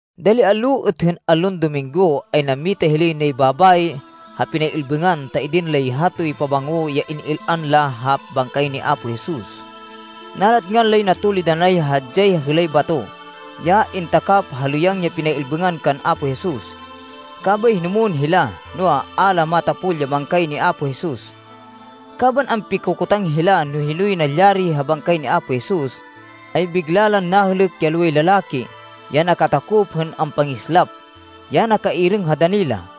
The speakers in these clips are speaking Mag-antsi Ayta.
Dali allo êt hên allon Dominggo, ay nammita hilay nay babayi ha pinay-ilbêngan ta idin lay hatoy pabango ya in-il-an la ha bangkay ni Apo Jesus. Nalatngan lay natulid anay hadyay hêlay bato, ya intakap ha lêyang ya pinay-ilbêngan kan Apo Jesus. Kabay hinumwên hila, noa, a la matapol ya bangkay ni Apo Jesus. Kaban ampikokotang hila no hinoy nalyari ha bangkay ni Apo Jesus, ay bigla lan nahêlêk ya loway lalaki, ya nakatakop hên ampangislap, ya nakairêng ha dani la.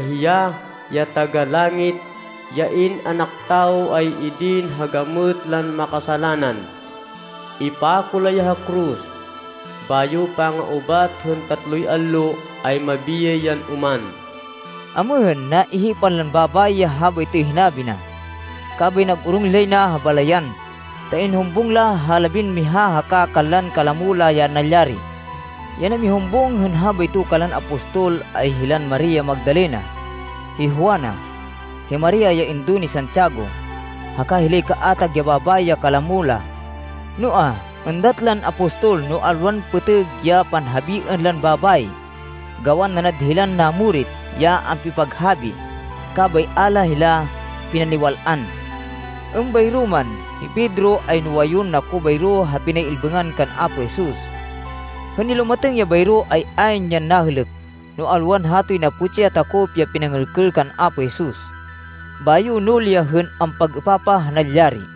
hiya, ya Taga-Langit, ya In-anak Tawo ay idin ha gamêt lan makasalanan. Ipako la ya ha koros. Bayo panga-ubat hên tatloy allo ay mabiyay yan oman.” Amêhên, naihipan lan babayi ya habaytoy hinabi na. Kabay nag-orong hilay na ha balayan, ta inhumbung la ha labinmiha haka kanlan kalamo la ya nalyari. Ya namihumbung hên habayto kanlan apostol ay hilan Maria Magdalena, hi Juana, hi Maria ya indo ni Santiago, haka hilay kaatag ya babayi ya kalamo la. Noa, êndat lan apostol, no alwan pêtêg ya panhabiên lan babayi, gawan nanad hilan namurit ya ampipaghabi. Kabay a la hila pinaniwal-an. Êmbayro man, hi Pedro ay nuwayun nako bayro ha pinay-ilbêngan kan Apo Jesus. Hên nilumatêng ya bayro ay ayn yan nahêlêk, no alwan hatoy naputsi ya takop ya pinangêlkêl kan Apo Jesus. Bayo nuli ya hên ampag-êpapah ha nalyari.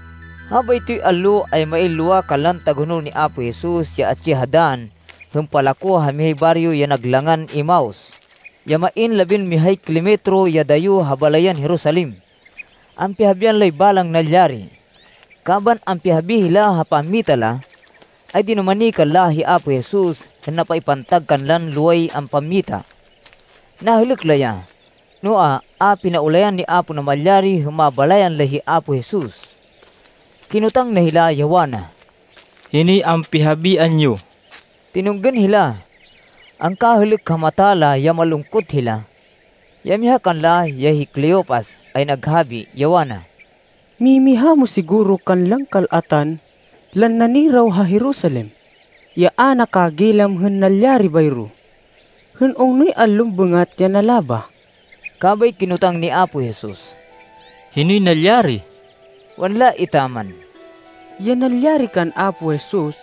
Habaytoy allo ay main lowa kanlan tagahonol ni Apo Jesus ya atsi ha dann hên palako ha mihay baryo ya nag langan Emaus, ya main labinmihay kilometro ya dayo ha balayan Jerusalem. Ampihabian lay balang nalyari. Kaban ampihabi hila ha pammita la, ay dinumani kanla hi Apo Jesus hên napaipantag kanlan loway ampammita. Nahêlêk la ya, noa, a pinaulayan ni Apo Namalyari hên mabalayan la hi Apo Jesus. Kinotang na hila, ya wana, “Hinoy ampihabian yo?” Tinunggên hila. Angkahêlêk ha mata la ya malungkot hila. Ya miha kanla, ya hi Cleopas, ay naghabi, ya wana, “Mimiha mo siguro kanlan kal-atan lan naniraw ha Jerusalem ya a nakagilam hên nalyari bayro hên ungnoy allon bêngat ya nalabah.” Kabay kinotang ni Apo Jesus, “Hinoy nalyari?” Wanla etaman, “Ya nalyari kan Apo Jesus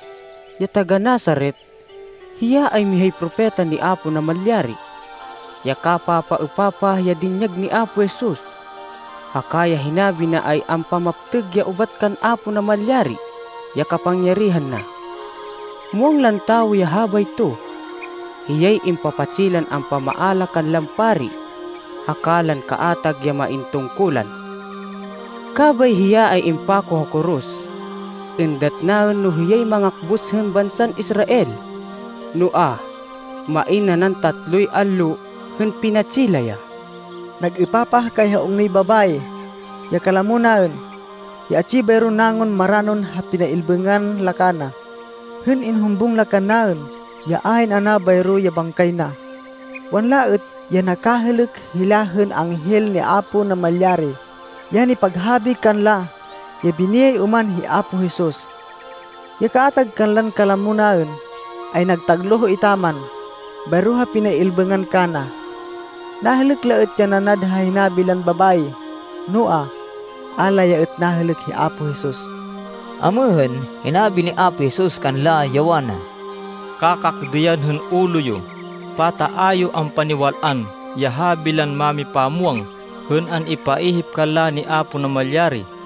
ya taga-Nazaret. Hiya ay mihay propeta ni Apo Namalyari. Ya kapapaêpapah ya dinyag ni Apo Jesus, haka ya hinabi na ay ampamaptêg ya ubat kan Apo Namalyari ya kapangyarihan na. Muwang lan tawo ya habayto. Hiyay impapatsi lan ampamaala kanlan pari haka lan kaatag ya main tungkulan, kabay hiya ay impako ha koros. Êndat naên no hiyay mangakbus hên bansan Israel. Noa, main nanan tatloy allo hên pinatsi la ya. Nag-êpapah kay ha ungnoy babayi, ya kalamo naên, ya atsi bayro nangun maranon ha pinay-ilbêngan la kana, hên inhumbung la kannaên ya ayn ana bayro ya bangkay na. Wanla êt ya nakahêlêk hila hên anghel ni Apo Namalyari ya nipaghabi kanla ya biniyay oman hi Apo Jesus. Ya kaatag kanlan kalamo naên ay nagtagloh etaman bayro ha pinay-ilbêngan kana. Nahêlêk la êt ya nanad ha hinabi lan babayi, noa, a la ya êt nahêlêk hi Apo Jesus.” Amêhên, hinabi ni Apo Jesus kanla, ya wana, “Kakakdêyan hên ulo yo! Pata a yo ampaniwal-an ya habi lan mámipamwang hên an-ipaihip kanla ni Apo Namalyari?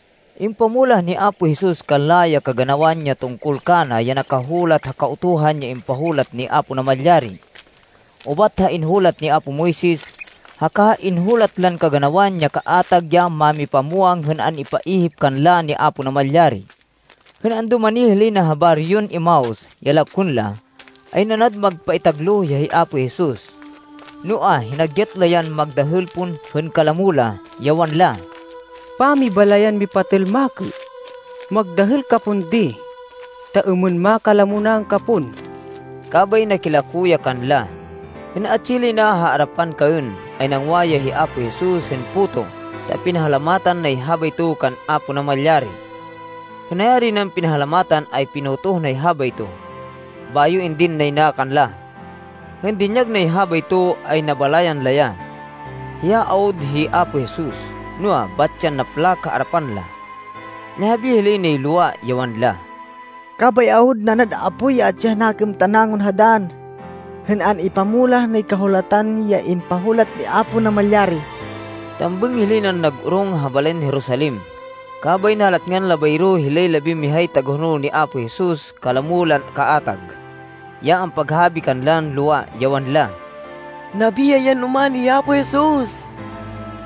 Impamulah ni Apo Jesus kanla ya kaganawan ya tungkol kana ya nakahulat ha Kahulatan ya impahulat ni Apo Namalyari, ubat ha inhulat ni apo Moises, haka ha inhulat lan kaganawan ya kaatag ya mámipamwang hên an-ipaihip kanla ni Apo Namalyari. Hên andumani hilay na ha baryon Emaus, ya lakwên la, ay nanad magpaitagloh ya hi Apo Jesus. Noa, hinagyat la yan magdahêl pon hên kalamo la, ya wanla, “Pamibalayan mipatêl makê! Magdahêl ka pon di, ta êmên makalamo naên ka pon.” Kabay nakilako ya kanla. Hên atsi hilay na ha arapan kaên, ay nangwa ya hi Apo Jesus hên puto ta pinahalamatan nay habayto kan Apo Namalyari. Hên nayari nan pinahalamatan ay pinotoh nay habayto, bayo indin nay na kanla. Hên dinyag nay habayto, ay nabalayan la ya. Hiya awud hi Apo Jesus. Noa, bat yan naplak ha arapan la. Nihabi hilay nay lowa, ya wanla, “Kabay awud nanad apoy ya atsi ha nakêm ta nangun ha dann, hên an-ipamulah nay Kahulatan ya impahulat ni Apo Namalyari.” Tambêng hilay nan nag-orong ha balayan Jerusalem, kabay nalatngan la bayro hilay labinmihay tagahonol ni Apo Jesus kalamo lan kaatag, ya ampaghabi kanlan lowa, ya wanla, “Nabiyay yan oman hi Apo Jesus.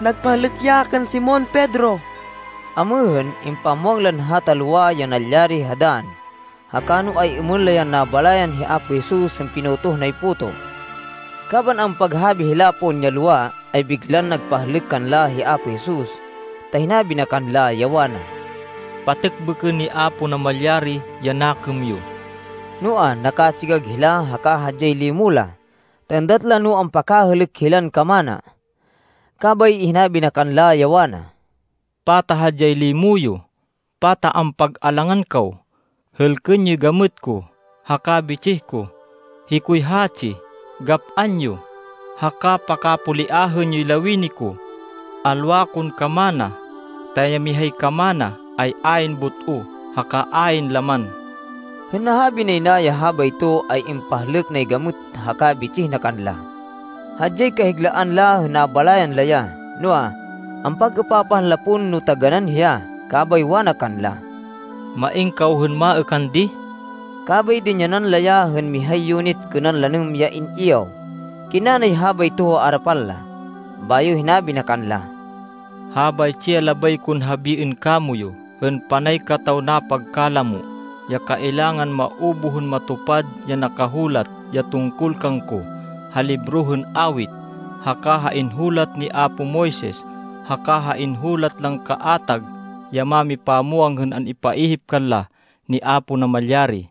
Nagpahlêk ya kan Simon Pedro!” Amêhên, impamwang lan hata lowa ya nalyari ha dann, haka no ay-êmên la yan nabalayan hi Apo Jesus hên pinotoh nay puto. Kaban ampaghabi hila pon ya lowa, ay biglan nagpahlêk kanla hi Apo Jesus, ta hinabi na kanla, ya wana, “Patêkbêkên ni Apo Namalyari ya nakêm yo.” Noa, nakatsigag hila haka hadyay limo la, ta êndat la no ampakahêlêk hilan kamana. Kabay hinabi na kanla, ya wana, “Pata hadyay limo yo? Pata ampag-alangan kaw? Hêlkên yoy gamêt ko haka bitsih ko. Hikoy hatsi. Gap-an yo, haka pakapoliahên yoy lawini ko. Alwa kon kamana, ta ya mihay kamana ay ayn but-o haka ayn laman.” Hên nahabi nay na ya habayto, ay impahlêk nay gamêt haka bitsih na kanla. Hadyay kahiglaan la hên nabalayan la ya, noa, ampag-êpapahan la pon no taganán hiya, kabay wana kanla, “Main kaw hên maêkan di?” Kabay dinyanan la ya hên mihay yunit kênan lanêm ya in-iyaw. Kinna nay habayto ha arapan la. Bayo hinabi na kanla, “Habaytsi ya labay kon habiên kamoyu hên panay kataw napagkalamo, ya kailangan maubuh hên matupad ya nakahulat ya tungkol kangko ha libro hên Awit, haka ha inhulat ni apo Moises, haka ha inhulat lan kaatag ya mámipamwang hên an-ipaihip kanla ni Apo Namalyari.”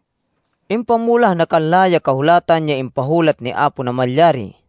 Impamulah na kanla ya Kahulatan ya impahulat ni Apo Namalyari,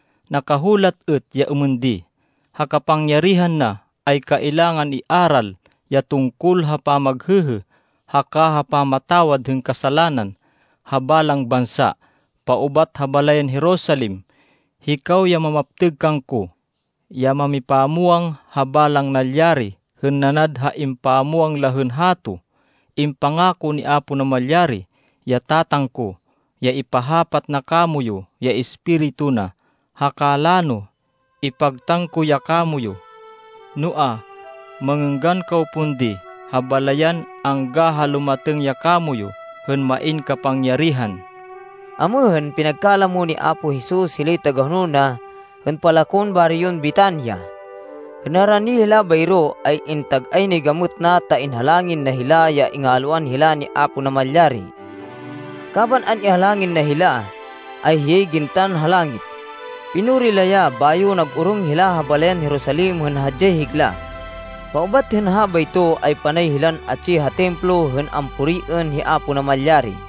Nakahulat êt ya êmên di, ‘Ha kapangyarihan na ay kailangan iaral ya tungkol ha pamaghêhê haka ha pamatawad hên kasalanan ha balang bansa paubat ha balayan Jerusalem.’ Hikaw ya mamaptêg kangko, ya mamipamwang ha balang nalyari hên nanad ha impamwang la hên hato. Impangako ni Apo Namalyari, ya Tatang ko, ya ipahapat na kamoyu ya Espiritu na, haka lano ipagtan ko ya kamoyu. Noa, mangênggan kaw pon di ha balayan angga ha lumatêng ya kamoyu hên main kapangyarihan.” Amêhên, pinagkalamo ni Apo Jesus hilay tagahonol na hên palakon baryon Betania. Hên narani hila bayro, ay intag-ay nay gamêt na ta inhalangin na hila ya ingalwan hila ni Apo Namalyari. Kaban an-ihalangin na hila, ay hiyay gintan ha langit. Pinuri la ya, bayo nag-orong hila ha balayan Jerusalem hên hadyay higla. Paubat hên habayto, ay panay hilan atsi ha Templo hên ampuriên hi Apo Namalyari.